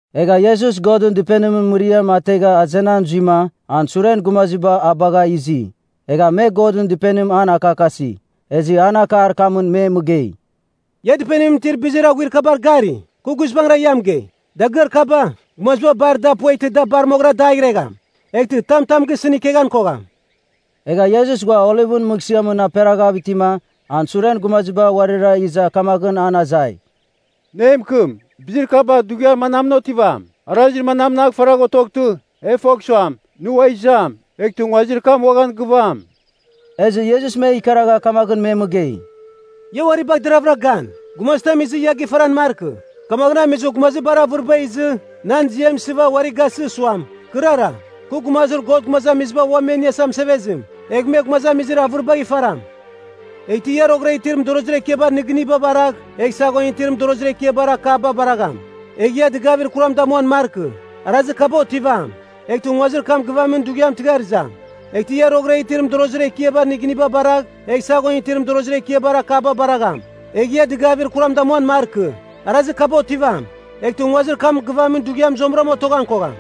Egha Iesus Godɨn Dɨpenimɨn mɨriam ategha azenan zuima, an suren gumaziba a bagha izi. Egha me Godɨn Dɨpenim an akakasi. Ezɨ an akar kamɨn me mɨgei, “Ia Dɨpenimɨn itir bizir aghuir kabar gari? Kɨ guizbangɨra ia mɨgei, dagɨar kaba, gumaziba bar da pueghtɨ da bar moghɨra dagh iregham. Eghtɨ tam tam gisɨn ikeghan kogham.” Egha Iesus ghua Olivɨn Mɨghsɨamɨn aperaghav itima, an suren gumaziba uarira iza kamaghɨn an azai, “Nɨ e mɨkɨm, bizir kaba dughiar manamɨn otivam? Arazir manamnagh faragh otoghtɨ, e fogh suam, ‘Nɨ ua izam,’ eghtɨ nguazir kam uaghan gɨvam?” Ezɨ Iesus me ikaragha kamaghɨn me mɨgei, “Ia uari bagh deraghvɨra gan, gumazitam izɨ ia gifaran markɨ. Kamaghɨn amizɨ, gumazir bar avɨriba izɨ, nan ziam isɨva uari gasɨ suam, ‘Kɨrara, kɨ Gumazir God Gumazamiziba Ua Me Iniasa Mɨsevezim.’ Egh me gumazamizir avɨribagh ifaram. Eghtɨ ia roghɨra itir mɨdorozir ekiabar nɨgɨniba baragh, egh saghon itir mɨdorozir ekiabar akaba baragham. Egh ia dɨgavir kuram damuan markɨ. Arazir kaba otivam, eghtɨ nguazir kam gɨvamin dughiam tɨghar izam. Eghtɨ ia roghɨra itir mɨdorozir ekiabar nɨgɨniba baragh, egh saghon itir mɨdorozir ekiabar akaba baragham. Egh ia dɨgavir kuram damuan markɨ. Arazir kaba otivam, eghtɨ nguazir kam gɨvamin dughiam zuamɨra otoghan kogham.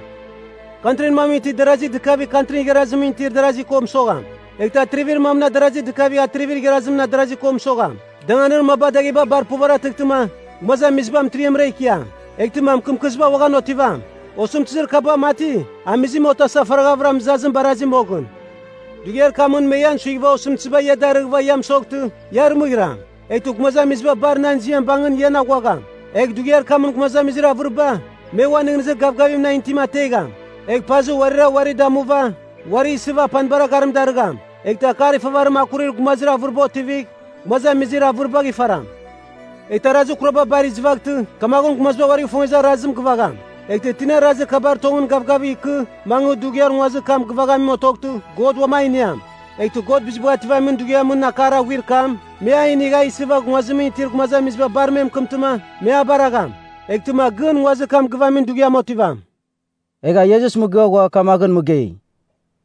Kantrin mamɨn itir darazi dɨkavigh kantrin igharazimɨn itir darazi ko mɨsogham. Eghtɨ atrivir mamɨn adarazi dɨkavigh atrivir igharazimɨn adarazi ko mɨsogham. Danganir mabar dagheba bar puvaratɨghtɨma, gumazamiziba mɨtiriamra ikiam. Eghtɨma mɨkɨmkɨziba uaghan otivam. Osɨmtɨzir kaba mati, amizim otasa faraghavɨra mɨzazim barazi moghɨn. “Dughiar kamɨn me ian suighɨva osɨmtɨziba ia darɨghɨva ia mɨsoghtɨ, ia arɨmɨghiram. Eghtɨ gumazamiziba bar nan ziam bangɨn ian aghuagham. Egh dughiar kamɨn gumazamizir avɨriba, me uan nɨghnɨzir gavgavir nan itim ategham. Egh pazɨ uarira uari damuva, uari isɨva apanibar agharim darɨgham. Eghtɨ akar ifavarim akurir gumazir avɨriba otivigh, gumazamizir avɨribagh ifaram. Eghtɨ arazir kuraba bar izɨvaghtɨ, kamaghɨn gumaziba uarigh ifongezir arazim, gɨvagham. Eghtɨ tina arazir kabar tongɨn gavgavigh ikɨ, mangɨ dughiar nguazir kam gɨvaghamim otoghtɨ, God uam a iniam. Eghtɨ God Bizibagh Ativamin Dughiamɨn akar aghuir kam, me a inigh a isɨva nguazimɨn itir gumazamiziba bar me mɨkɨmtɨma, me a baragham. Eghtɨma gɨn nguazir kam gɨvamin dughiam otivam.” Egha Iesus mɨgɨa ghua kamagh mɨgei,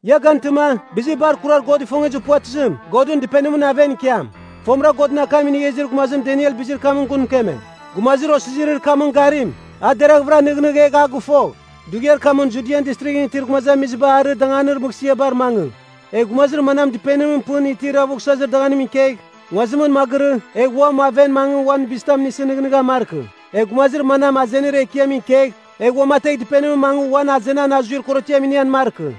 “Ia gantɨma, bizir bar kurar God ifongezir puvatɨzim, Godɨn Dɨpenimɨn aven ikiam. Fomɨra Godɨn akam inigha izir gumazim Daniel bizir kamɨn gun mɨkeme. (Gumazir osizirir kamɨn garim, a deraghvɨra nɨghnɨgh egh a gɨfogh.) Dughiar kamɨn Judian Distrighɨn itir gumazamiziba arɨ danganir mɨghsɨabar mangɨ. Egh gumazir manam dɨpenimɨn pɨn itir avughsazir danganimɨn ikegh, nguazimɨn magɨrɨ, egh uam aven mangɨ uan bizitam inisɨ nɨghnɨghan markɨ. Egh gumazir manam azenir ekiamɨn ikegh, egh uamategh dɨpenimɨn mangɨ uan azenan azuir korotiam inian markɨ.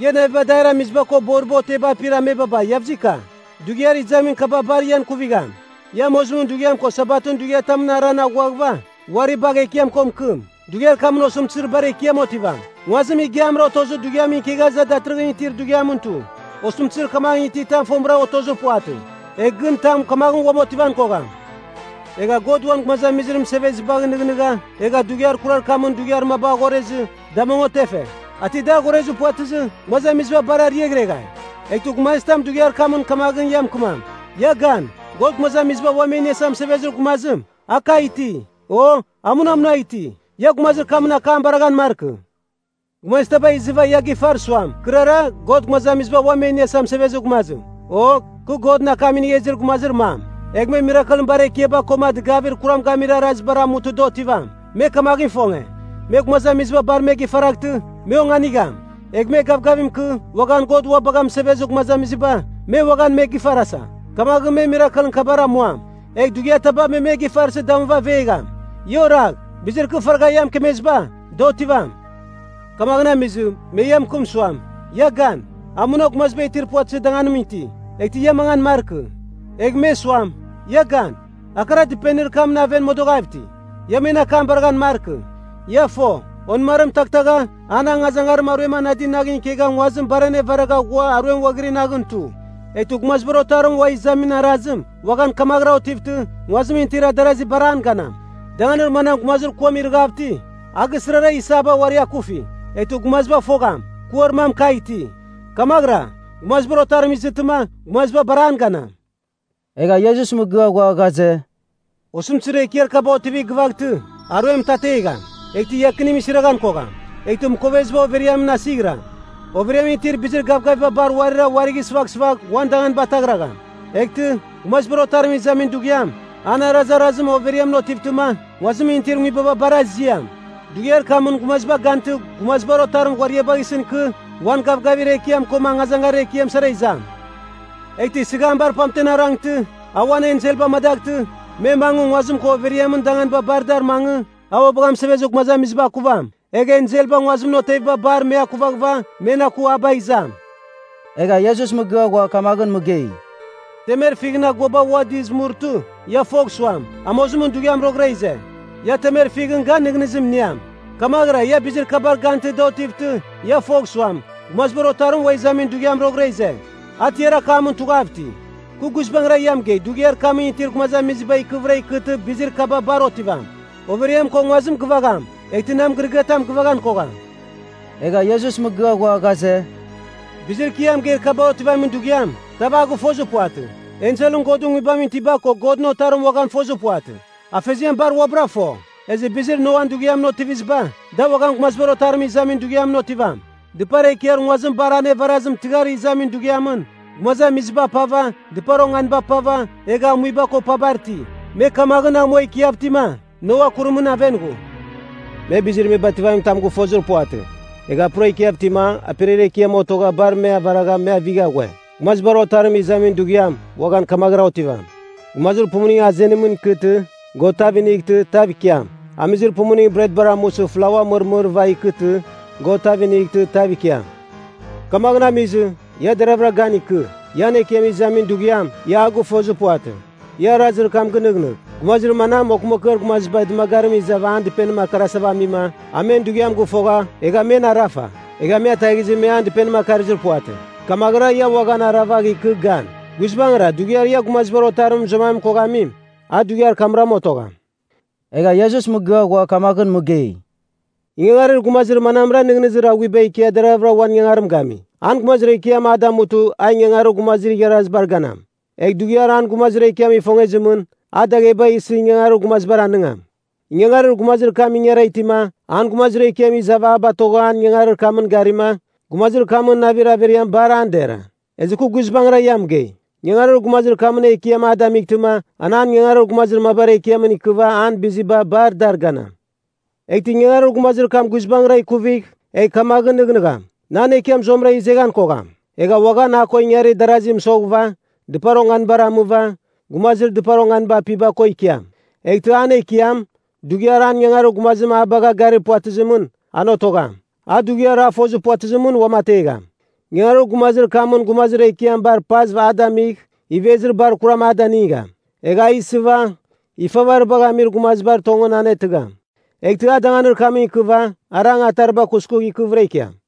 Ia naviba adair amiziba ko boriba oteba apir amebaba Iavzika! Dughiar izamin kaba bar ian ikuvigham! Ia amozimɨn dughiam ko Sabatɨn dughiatamɨn aran aghuaghɨva, uari bagh Ekiam ko mɨkɨm. Dughiar kamɨn osɨmtɨzir bar ekiam otivam, nguazim igiamra otozir dughiamɨn ikegha iza datɨrɨghɨn itir dughiamɨn tu, osɨmtɨzir kamaghɨn ititam fomɨra otozir puvatɨ, egh gɨn tam kamaghɨn uam otivan kogham. Egha God uan gumazamizir mɨsevezibagh nɨghnɨgha, egha dughiar kurar kamɨn dughiar maba aghorezɨ, da mong otefe. A ti dar aghorezir puvatɨzɨ, gumazamiziba bar ariaghreghai. “Eghtɨ gumazitam dughiar kamɨn kamaghɨn ia mɨkɨmam, ‘Ia gan, God Gumazamiziba Ua Me Iniasa Mɨsevezir Gumazim, a kagh iti,’ o ‘a muna munagh iti,’ ia gumazir kamɨn akam baraghan markɨ. Gumazitaba izɨva ia gifar suam, ‘Kɨrara, God Gumazamiziba Ua Me Iniasa Mɨsevezir Gumazim,’ o ‘kɨ Godɨn akam inigha izir gumazir mam,’ egh me mirakelɨn bar ekiaba koma dɨgavir kuram gamir arazibar amutɨ da otivam. Me kamaghɨn ifonge, me gumazamiziba bar me gifaraghtɨ, me onganigham. Egh me gavgavim ikɨ, uaghan God ua bagha mɨsevezir gumazamiziba, me uaghan me gifarasa. Kamaghɨn me mirakelɨn kabar amuam. Egh dughiataba me me gifarsɨ damuva avegham. Ia oragh! Bizir kɨ faragha ia mɨkemeziba, da otivam. “Kamaghɨn amizɨ, me ia mɨkɨm suam, ‘Ia gan. A muna gumaziba itir puvatɨzir danganimɨn iti,’ eghtɨ ia mangan markɨ. Egh me suam, ‘Ia gan. A kara, dɨpenir kamɨn aven modoghav iti,’ ia men akam baraghan markɨ. Ia fo, onɨmarim taghtagha, an angazangarim aruem anadi naghɨn ikegha nguazim bar anevaragha ghua aruem ghuaghiri naghɨn tu. Eghtɨ Gumazibar Otarim ua izamin arazim, uaghan kamaghɨram otivtɨ, nguazimɨn itir darazi bar an ganam. “Danganir manam gumazir kuam irɨghav iti, a gisɨrara isaba uari akufi, eghtɨ gumaziba fogham, kuar mam kagh iti. Kamaghɨra, Gumazibar Otarim izɨtɨma, gumaziba bar an ganam.” Egha Iesus mɨgɨa ghua ghaze, “Osɨmtɨzir ekiar kaba otivigh gɨvaghtɨ, ‘Aruem mɨtategham, eghtɨ iakinim isiraghan kogham, eghtɨ mɨkoveziba overiamɨn asighɨram, overiamɨn itir bizir gavgaviba bar uarira uari sɨvaghsɨvagh, uan danganiba ataghragham.’ “Eghtɨ, Gumazibar Otarim izamin dughiam, an arazarazim overiamɨn otivtɨma, nguazimɨn itir nguibaba bar aziam. Dughiar kamɨn gumaziba gantɨ Gumazibar Otarim ghuariabagh isɨn ikɨ, uan gavgavir ekiam koma angazangarir ekiam sara izam. Eghtɨ sɨgham bar pamten arangtɨ, a uan enselba amadaghtɨ, me mangɨ nguazim ko overiamɨn danganiba bar dar mangɨ, a ua bagha mɨsevezir gumazamiziba akuvam, egh enselba nguazimɨn oteviba bar, me akuvaghɨva, men aku a bagh izam.” Egha Iesus mɨgɨa ghua kamaghɨn mɨgei, “Temer fighɨn aguaba ua dɨz murtɨ, ia fogh suam, amozimɨn dughiam roghɨra ize. Ia temer fighɨn gan nɨghnɨzim iniam. Kamaghɨra ia bizir kabar gantɨ da otivtɨ, ia fogh suam, Gumazibar Otarim a ua izamin dughiam roghɨra ize. A tiar akamɨn tughav iti. Kɨ guizbangɨra ia mɨgei dughiar kamɨn itir gumazamizir kaba ikɨvɨra ikɨtɨ bizir kaba bar otivam. Overiam ko nguazim givagham, eghtɨ nan mɨgɨrɨgɨatam gɨvaghan kogham.” Egha Iesus mɨgɨa ghua ghaze, “Bizir kɨ ia mɨgeir kaba otivamin dughiam, tav a gɨfozir puvatɨ. Enselɨn Godɨn Nguibamɨn itiba ko Godɨn Otarim uaghan fozir puvatɨ. Afeziam bar uabɨra fo. Ezɨ bizir Noan dughiamɨn otiviziba, da uaghan Gumazibar Otarim izamin dughiamɨn otivam. Dɨpar ekiar nguazim bar anevarazim tɨghar izamin dughiamɨn, gumazamiziba apava, dɨpar onganiba apava, egha amuiba ko pabar iti. Me kamaghɨn amua ikiav itima, Noa kurimɨn aven ghu. Me bizir me bativamin tam gɨfozir puvatɨ, egha pura ikiav itima, aperiar ekiam otogha bar me avaragha me avigha ghue. Gumazibar Otarim izamin dughiam, uaghan kamaghɨrama otivam. Gumazir pumuning azenimɨn ikɨtɨ, God tav inightɨ, tav ikiam. Amizir pumuning bretbar amusɨ flaua mɨrmɨrɨva ikɨtɨ, God tav inightɨ, tav ikiam. “Kamaghɨn amizɨ, ia deragh gan ikɨ. Ian Ekiam izamin dughiam, ia a gɨfozir puvatɨ. Ia arazir kam gɨnɨghnɨgh. Gumazir manam, okɨmakɨar gumaziba dɨmagarimɨn izava an dɨpenim akarasava amima, a men dughiam gɨfogha, egha men arafa. Egha me ataghizɨ me an dɨpenim akarɨzir puvatɨ. Kamaghɨra, ia uaghan aravagh ikɨ gan. Guizbangɨra, dughiar ia Gumazibar Otarim mɨzuaman koghamim, a dughiar kamram otogham.” Egha Iesus mɨgɨa ghua kamaghɨn mɨgei, “Ingangarir gumazir manamra nɨghnɨzir aghuiba ikia deravɨra uan ingangarim gami? An gumazir ekiam a damutɨ, a ingangarir gumazir igharazibar ganam. Egh dughiar an gumazir ekiam ifongezimɨn, a dagheba isɨ ingangarir gumazibar anɨngam. Ingangarir gumazir kam ingara itima, an gumazir ekiam izava a batogha an ingangarir kamɨn garima, gumazir kamɨn navir averiam bar an dera. Ezɨ kɨ guizbangɨra ia mɨgei, ingangarir gumazir kamɨn ekiam a damightɨma, an an ingangarir gumazir mabar ekiamɨn ikɨva an biziba bar dar ganam. Eghtɨ ingangarir gumazir kam guizbangɨra ikuvigh, egh kamaghɨn nɨghnɨgham, ‘Nan ekiam zuamɨra izeghan kogham.’ Egha uaghan a ko ingarir darazi mɨsoghɨva, dɨpar onganibar amɨva, gumazir dɨpar onganiba apiba ko ikiam. Eghtɨ an ekiam, dughiar an ingangarir gumazim a bagha garir puvatɨzimɨn, an otogham. A dughiar a fozir puvatɨzimɨn uamategham. Ingangarir gumazir kamɨn gumazir ekiam bar pazav, a damigh, ivezir bar kuram a danɨngam. Egh a isɨva ifavaribagh amir gumazibar tongɨn anetɨgham. Eghtɨ a danganir kamɨn ikɨva, arang atariba kuskugh ikɨvɨra ikiam.”